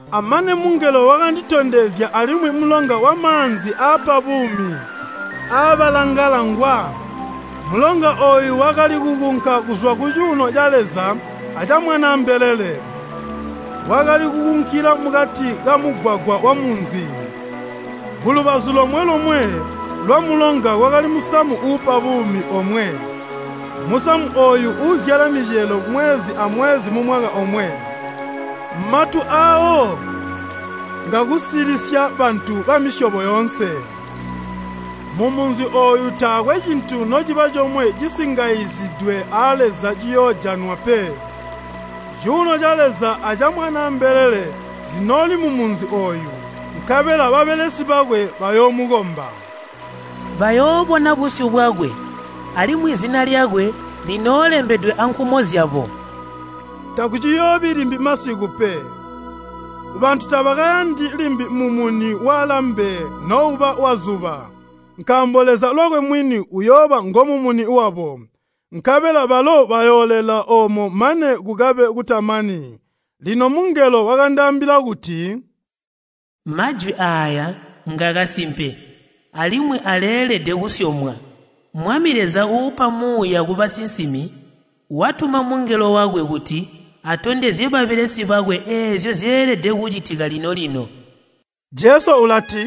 Amane mungelo wakanditondezya alimwi mulonga wamaanzi aapa buumi aabalangala ngwa. Mulonga ooyu wakali kukunka kuzwa kucuuno ca Leza aca Mwanaa mbelele. Wakali kukunkila mukati kamugwagwa wamunzi. Kulubazu lomwe-lomwe lwamulonga kwakali musamu uupa buumi omwe. Musamu ooyu uzyala micelo mwezi amwezi mumwaka omwe, matu aawo ngakusilisya bantu bamisyobo yoonse. Mumunzi ooyu taakwe cintu nociba comwe cisingayizidwe a Leza ciyoojanwa pe. Cuuno ca Leza aca Mwanaa mbelele zinooli mumunzi ooyu, nkabela babelesi bakwe bayoomukomba. Bayoobona busyu bwakwe, alimwi zina lyakwe linoolembedwe ankumo zyabo. Takuciyoobi limbi masiku pe. Bantu tabakayandi limbi mumuni walambe nouba wazuba, nkaambo Leza lwakwe mwini uyooba ngomumuni wabo, nkabela balo bayoolela oomo mane kukabe kutamani. Lino mungelo wakandaambila kuti, “Majwi aaya ngakasimpe alimwi aleelede kusyomwa. Mwami Leza uupa Muuya kubasinsimi, watuma mungelo wakwe kuti atondezye babelesi bakwe eezyo zyeelede kucitika lino-lino.” Jesu ulati,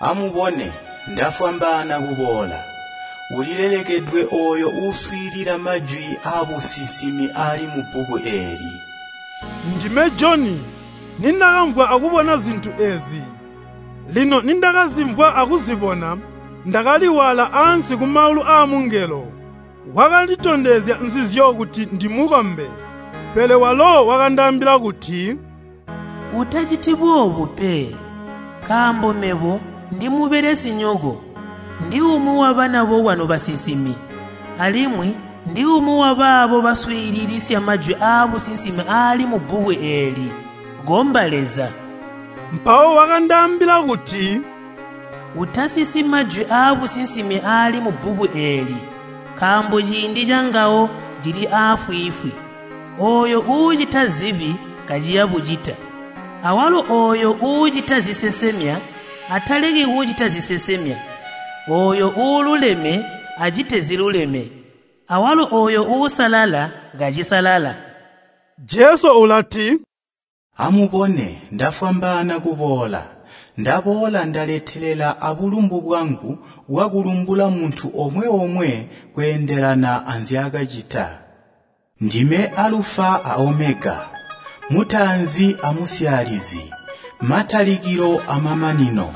“Amubone, ndafwambaana kuboola! Ulilelekedwe ooyo uuswiilila majwi aabusinsimi aali mubbuku eeli!” Ndime Joni, nindakamvwa akubona zintu eezi. Lino nindakazimvwa akuzibona, ndakali waala ansi kumaulu aamungelo wakanditondezya nzizyo kuti ndimukombe. Pele walo wakandaambila kuti, “Utaciti boobu pe, nkaambo mebo ndimubelesinyoko, ndiumwi wabana bokwanu basinsimi, alimwi ndiumwi wabaabo baswiililisya majwi aabusinsimi aali mubbuku eeli! Komba Leza!” Mpawo wakandaambila kuti, “Utasisi majwi aabusinsimi aali mubbuku eeli nkaambo ciindi cangawo cili aafwiifwi. Ooyo uucita zibi kaciya bucita, awalo ooyo uucita zisesemya ataleki kucita zisesemya, ooyo uululeme acite ziluleme, awalo ooyo uusalala kacisalala.” Jesu ulati, “Amubone! Ndafwambaana kuboola, ndaboola ndaletelela abulumbu bwangu bwakulumbula muntu omwe-omwe kweendelana anzyaakacita. Ndime Alufa a Omega, mutaanzi amusyaalizi, matalikilo amananino.”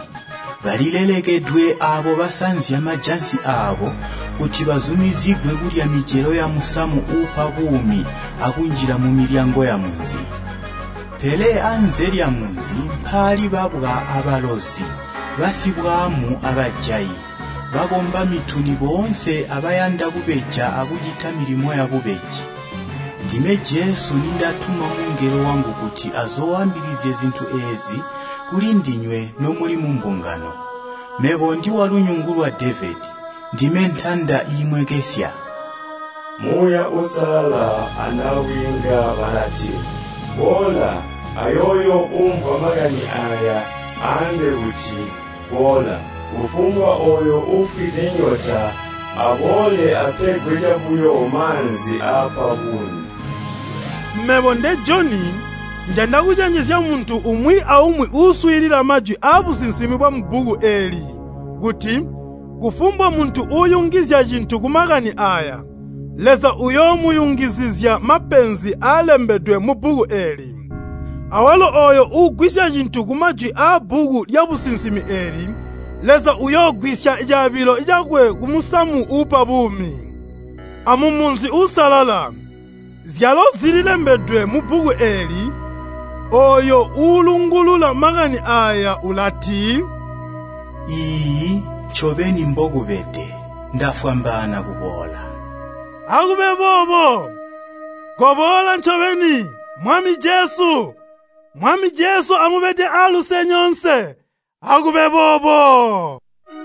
Balilelekedwe aabo basanzya majansi aabo, kuti bazumizigwe kulya micelo yamusamu uupa buumi akunjila mumilyango yamunzi. Pele anze lyamunzi mpaali babwa abalozi, basibwaamu abajayi, bakomba mituni boonse abayanda kubeja akucita milimo yabubeji. “Ndime Jesu nindatuma mungelo wangu kuti azooambilizye zintu eezi kulindinywe nomuli mumbungano. Mebo ndiwalunyungu lwa Devedi, ndime ntanda iimwekesya.” Muuya Uusalala anabwiinga balati, “Boola!” Ayooyo uumvwa makani aaya aambe kuti, “Boola!” Kufumbwa ooyo uufwide nyota aboole apegwa cabuyo maanzi aapa buumi. Mebo nde Joni, njanda kucenjezya muntu umwi aumwi uuswiilila majwi aabusinsimi bwamubbuku eeli kuti, kufumbwa muntu uuyungizya cintu kumakani aaya, Leza uyoomuyungizizya mapenzi aalembedwe mubbuku eeli. Awalo ooyo uugwisya cintu kumajwi aabbuku lyabusinsimi eeli, Leza uyoogwisya caabilo cakwe kumusamu uupa buumi, amumunzi uusalala, zyalo zili zilembedwe mubbuku eeli. Ooyo uulungulula makani aaya ulati, “Iiyi, ncobeni mbokubede! Ndafwambaana kuboola.” Akube boobo! Koboola ncobeni, Mwami Jesu! Mwami Jesu amubede aaluse nyoonse. Akube boobo.